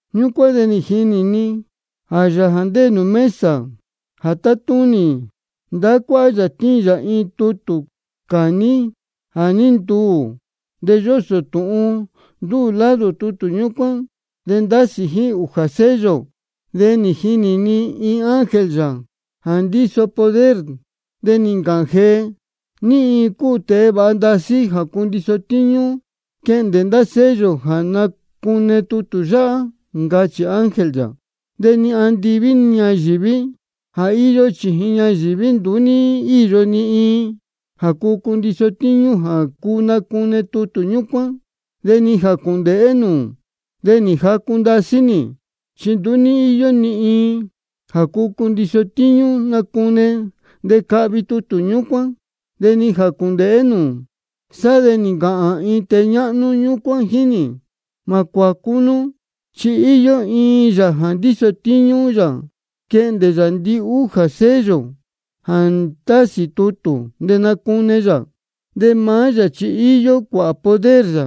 Ñúcuán de nī jinī ni jā Yāā jā ndéē mesa jā tátúnī, ndahá cuáhá yā tíin yā iin tutū cāní jā ní ntuū. De yósō tūhun ndúū lado tutū ñúcuán, de ndásī jíín ūjā sello. De nī jinī ni iin ángel yā jā ndíso poder, de nī ncāhān jee: ¿Ní iin cúu tēe vāha ndasí jā cundiso tíñú quehndē ndá sello de nacune tutū yáhá? ncachī ángel yā. De ni andiví ni ñayīví ni jā íyó chījin ñayīví, nduú ní íyo ni iin jā cuu cundiso tíñú jā nacune tutū ñúcuán, de ni jā cūndēhé nūū. De nī jacu ndasí nī, chi nduú ní íyo ni iin jā cuu cundiso tíñú nacune de cahvi tutū ñúcuán, de ni jā cūndēhé nūū. Sá de nī ncāhān iin tēe ñáhnú ñúcuán jíín nī: Mā cuācú nú, chi íyó iin Yāā jā ndíso tíñú yā quehndē yā ndihújā sello jā ndásī tutū, de nacune yā. De maá yā chi íyó cuāhā poder yā,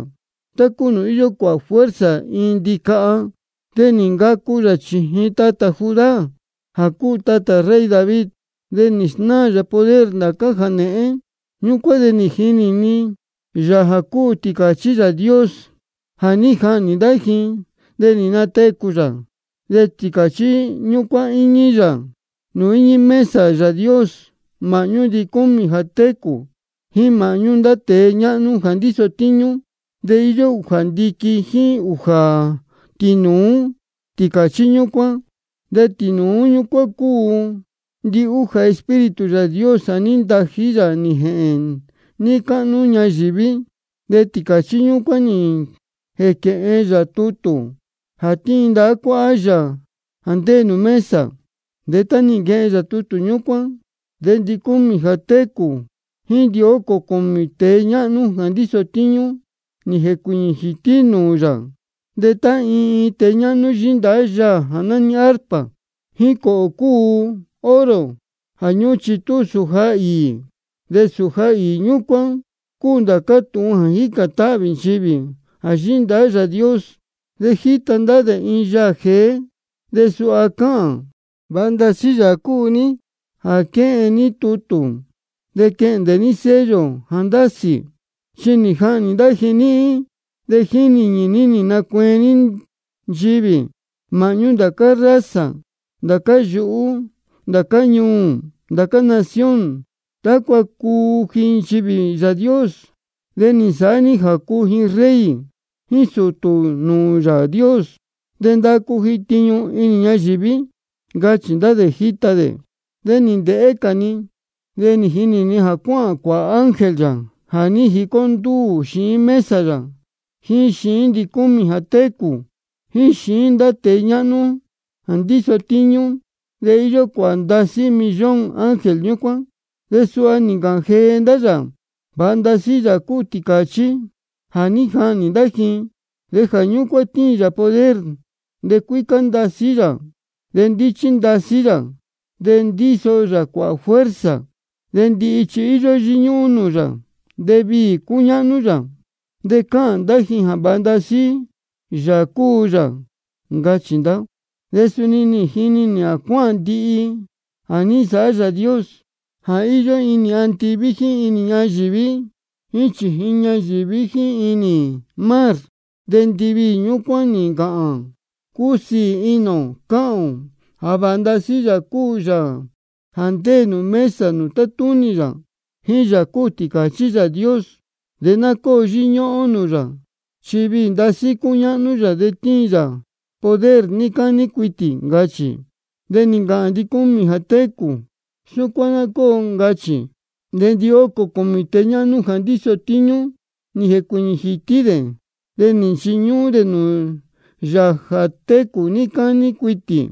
tá cúu nūū íyó cuāhā fuerza iin ndicaha. De nī ncacu yā chījin tatā Judá, jā cúu tatā rey David. De nī snáā yā poder ndācá jānēhén. Ñúcuán de nī jinī ni Yāā jā cúu Tīcāchí Yāā Dios jā ní jahnī ndá ji de nī natecū yā. De Tīcāchí ñúcuán íñí yā nūū íñí mesa Yāā Dios, māhñú ndicúmī jā técū jíín māhñú ndá tēe ñáhnú jā ndíso tíñú. De íyó ūjā ndiquin jíín ūjā tīnūú Tīcāchí ñúcuán. De tīnūú ñúcuán cúu ndihújā Espíritu Yāā Dios jā ní ntají yā nī jēhēn níí cáhnú ñayīví. De Tīcāchí ñúcuán nī jēquehen yā tutū jā tíin ndahá cuáhá Yāā jā ndéē nūū mesa. De tá nī nquehen yā tutū ñúcuán, de ndicúmī jā técū jíín ndihócō cūmī tēe ñáhnú jā ndíso tíñú nī jēcuīñī jītí nūū yā. De tá iin iin tēe ñáhnú yíndahá yaā jā nání arpa, jíín cōhō cūu oro jā ñúhún chitú sūja īī. De sūja īī ñúcuán cúu ndācá tūhun jā jícān táhvī nchivī jā yíhí ndahá Yāā Dios. De nī jita ndá dē iin yaā jeé, de suha cáhān: Vāha ndasí Yāā cúu ní jā quehen ní tutū de quehndē ní sello jā ndásī. Chi nī jahnī ndá ji níhín, de jíín nīñī ní nī nacueen ní nchivī māhñú ndācá raza, ndācá yuhú, ndācá ñuū, ndācá nación, tácua cuu ji nchivī Yāā Dios. De nī nsāhá ní jā cuu ji rey jíín sūtū nūū Yāā Dios, de ndacu ji tiñu inī ñayīví. Ncachī ndá dē jíta dē. De nī ndēhé cā ni, de nī jini nī jā cáhān cuāhā ángel yā jā ní jicó ndúū xiín mesa yā, jíín xiín ndicúmī jā técū, jíín xiín ndá tēe ñáhnú ndíso tíñú. De íyó cuāhā ndasí millón ángel ñúcuán. De suha nī ncāhān jee ndá yā: Vāha ndasí Yāā cúu Tīcāchí jā ní jahnī ndá ji. De jā ñúcuán tíin yā poder, de cuícá ndasí yā, de ndíchí ndasí yā, de ndíso yā cuāhā fuerza, de ndihi chi íyó yíñúhún nūū yā, de viī cúñáhnú yā, de cáhān ndá ji jā vāha ndasí Yāā cúu yā. Ncachī ndá. De suni nī jini nī jā cáhān ndihi jā ní nsāhá Yāā Dios jā íyó inī andiví jíín inī ñayīví jíín chījin ñayīví jíín inī mar. De ndiviī ñúcuán nī ncāhān: Cúsiī inī ō cáhān ō jā vāha ndasí Yāā cúu Yāā jā ndéē nūū mesa nūū tátúnī yā, jíín Yāā cúu Tīcāchí Yāā Dios. De ná cóo yíñúhún ó nūū yā, chi viī ndasí cúñáhnú yā, de tíin yā poder níí cání cuitī. Ncachī. De nī ncāhān ndicúmī jā técū: Súcuán ná cóo, ncachī. De ndihócō cūmī tēe ñáhnú jā ndíso tíñú nī jēcuīñī jītí dē, de nī nchiñúhún dē nūū Yāā jā técū níí cání cuitī.